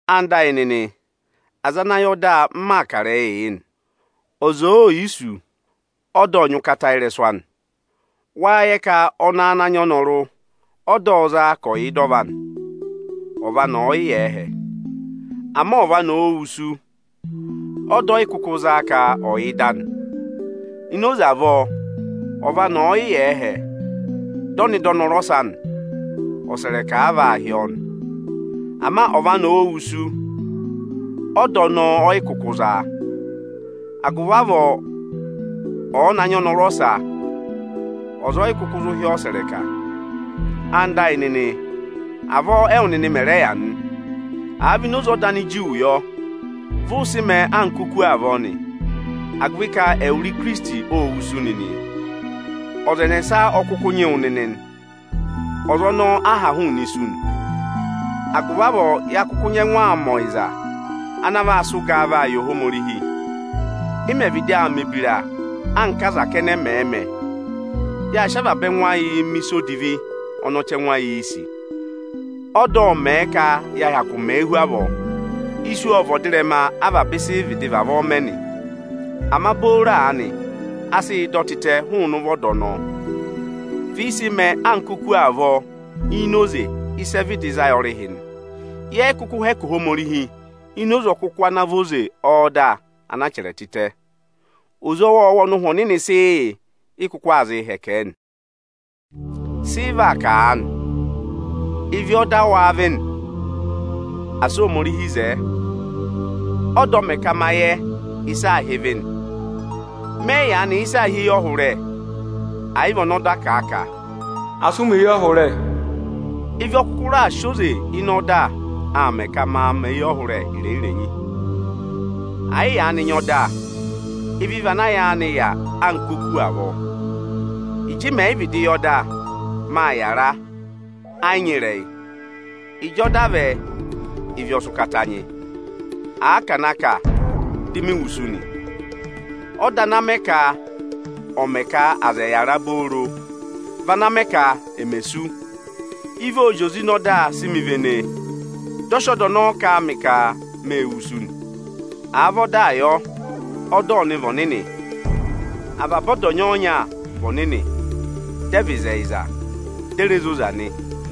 Ẹwụ nịnị ẹyịnyara amị, aza ana yẹ ọda, m maa kà ịrẹyịị yị nị. Ọza òo yi sú, ọda nyị ụkata ị́rẹsụ anị. Wâ yẹ ka ọnẹẹ ana nyị ọnọrụ, ọda ộ zaa ka ọ̀ yà ịda ọva anị, ọva anị ọ̀ọ yị yà ẹhẹ. Ama ọva anị òo wusu, ọda ọyị kụkụ zaa ka ọ̀ yị yà ịda anị. Ini oze avọọ, ọva anị ọ̀ọ yị yà ẹhẹ, dị ọ nọ ịda ọnọrụ ọsa nị, ọsẹrẹka a vaa hị́ ọọ nị. Ama ọva anị òo wusu, ọda ọnọọ ọ yị kụkụ zaa. Agụvị avọọ ọ̀ọ na nyị ọnọrụ ọsa, ọza ọyị kụkụ zụ hị́ ọọ ọsẹrẹka. Ẹwụ nịnị ẹyịnyara amị, avọọ ẹwụ nịnị mẹ̀ rẹ yà nị. Àa vị ini oze ọda Aniju yọ, vụ ụ sị mẹẹ anka oku avọọ nị, agụvị ka ẹwụrị Ikirisiti óo wusu nịnị. Ọza ẹnẹsa ọ kụkụ nyị wụ nịnị nị, ọza ọnọọ a ha hụụnị isu nị. Agụvị avọọ ya kụkụ nyẹngụ aa mẹ ọyịza ana vaa sị ụgaa vaa yị Ohomorihi. Ị mẹ̀ vịdị aa mẹ̀ ebira anka aza kẹnẹ mẹẹ̄ mẹ, yaa sị avaba ẹngụ ayịị mẹ̀ ịsa odivi ọnị ọchẹngụ ayịị̄ sì. Ọda ộ mẹ̀ ka ya hyakụụ mẹẹ hu avọọ. Isu ọ vị ọdịrẹma avaba ịsị ị vịdị vavọọ mẹ nị. Ama booro aanị a sị yị dọ tịtẹ hụụnị ụvọ ọda ọnọọ. Vị ị sị mẹẹ anka oku avọọ ini oze ịsị ẹ vịdị za yị ọrịhị nị. Yẹ yị kụkụ hẹkẹ Ohomorihi ini oze ọkụkụ ana vị oze ọda ana chẹrẹ tịtẹ; oze ọwọọwa ọnị Ụhwẹ Ọnịnị sị yị, ị kụkụ aa zịị hẹkẹ ẹ nị. Sị ị vaa kà aanị? Ịvị ọ́da wâ vị nị? Asị Ohomorihi zẹẹ! Ọda ọ mẹ ka ma yẹ ịsị aā hị́ ịvị nị. Mẹ yị yaanị yẹ ịsị aā hị́ eyọhụrẹ, ẹ̀ yị vị ọnị ọda kà a ka, “Asị ụ mẹ eyọhụrẹ!” Ịvị ọ kụkụ raà zị oze ịnị ọda aa mẹ ka maa mẹ̀ eyọhụrẹ irenyi-renyi. Ẹ yị yaanị nyị ọda, ịvị vị ana yaanị yà anka oku avọọ. Ịjị mẹ̀ yị vịdị yẹ ọda, máa yàra, ẹ yị nyị ịrẹyị. Ịjị ọda vẹ, ịvị ọ sị ụkata nyị, aa ka à na kà, di mi wusu nị. Ọda anaa mẹ ka ọ̀ mẹ ka aza ẹ̀ yàra booro, vị ana mẹ ka emè sú. Ịvị ộ zị oze ịnị ọda si mi vene, dị ọ sị ọda ọnọọ kà a mị ka mée wusu nị. Àa vị ọdaa yọ, ọda ọnị vị ọnịnị, avaba ọda ọnya-ọnya vị ọnịnị, dị ẹ vị ịzẹyịza, di e re zoza nị.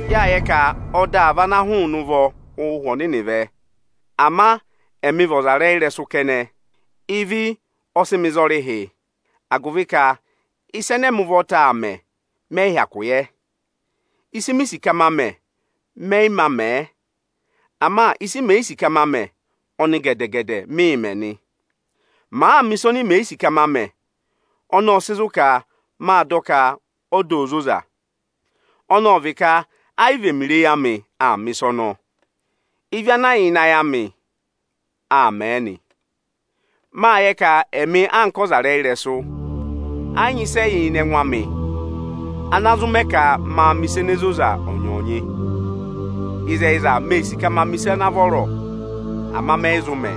Yâ yẹ ka ọda vị ana hụụnị ụvọ Ụhwẹ Ọnịnị vẹ, ama ẹmị vị ọzarẹyịrẹsụ kẹnẹ. Ịvị ọ sị mị za ọrịhị, agụvị ka ịsa ẹnẹ ẹmị ụvọta aa mẹ, mẹyị hyakụ yẹ. Ịsị mi sì ka ma mẹ, mẹ mā mẹẹ. Ama ịsị mè yi sì ka ma mẹ, ọnị gẹdẹ-gẹdẹ mịī mẹ nị. Màa mẹ̀ ịsa oni mè yi sì ka ma mẹ, ọnọọ ộ sị zụ̀ ka mâ dọ ka ọda ô zoza. Ọnọọ vị ka ayị vị ẹmịrị eyi amị aa mẹ̀ ịsa ọnọọ. Ịvị ana yà ịnị ayị amị aa mẹẹ nị. Mâ yẹ ka ẹmị anka ọzarẹyịrẹsụ, ẹ yị nyị ịsị ẹ yà ịnị ẹngụ amị ana zụ mẹ ka ma mẹ̀ ịsa ene zoza ọnyọọnyị. Ịzẹyịza mee sì ka maa mẹ̀ ịsa ana vọrọ, ama mẹyị zụ mẹẹ.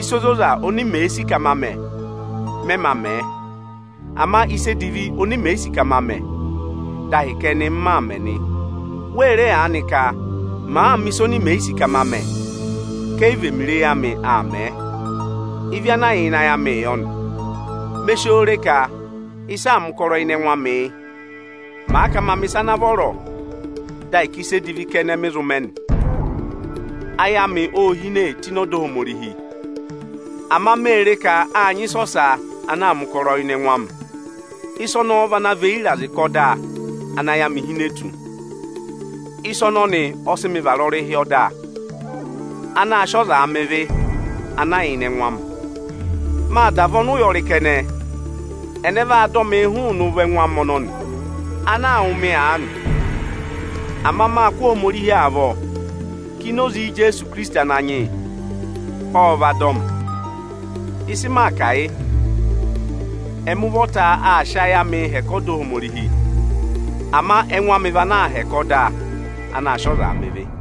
Ịsa ozoza oni mèee sì ka ma mẹ, mẹ mā mẹẹ. Ama ịsa edivi oni mè yi sì ka ma mẹ, dị ahịka ẹnị m maa mẹ̀ nị. Wee re aanị ka màa mẹ̀ ịsa oni mè yi sì ka ma mẹ, ka ayị vị ẹmịrị eyi amị aa mẹẹ; ịvị ana yà ịnị ayị amịị yọ nị. Me si oo re ka ịsị aa mẹ̀ ụkọrọ ịnị ẹngụ amị yị: Màa ka maa mẹ̀ ịsa ana vọrọ, dị ahịka ịsa edivi kẹnẹ mị zụ mẹ nị. Ayị amị ô hine tụ́ ịnị ọda Ohomorihi, ama mee re ka â nyị ịsa ọsa ana aa mẹ̀ ụkọrọ ịnị ẹngụ amị. Ịsa ọnọọ vị ana và eyi ịrazị kà ọda ana ayị amị hine tụ́. Ịsa ọnọnị ọ sị mị vara ọrịhị ọda anaā sịị ọzaa mẹ ịvị ana yà ịnị ẹngụ amị. Mâ da vị ọnụyọrị kẹnẹ! Ẹnẹ vaa dọ mịị hụụnị ụvọ ẹngụ amị ọnọnị, ana aa wụ̀ mị aanị? Ama mâ kụ́ Ohomorihi avọ ka ini oze Ijeesu Ikirisiti Ananyị yị ọ vaa dọ mị. Ịsị maa kà yị: Ẹmị ụvọta aa sị ayị amị hẹkẹ ọda Ohomorihi, ama ẹngụ amị vị ana aa hẹkẹ ọda anaā sịị ọzaa mẹ ịvị.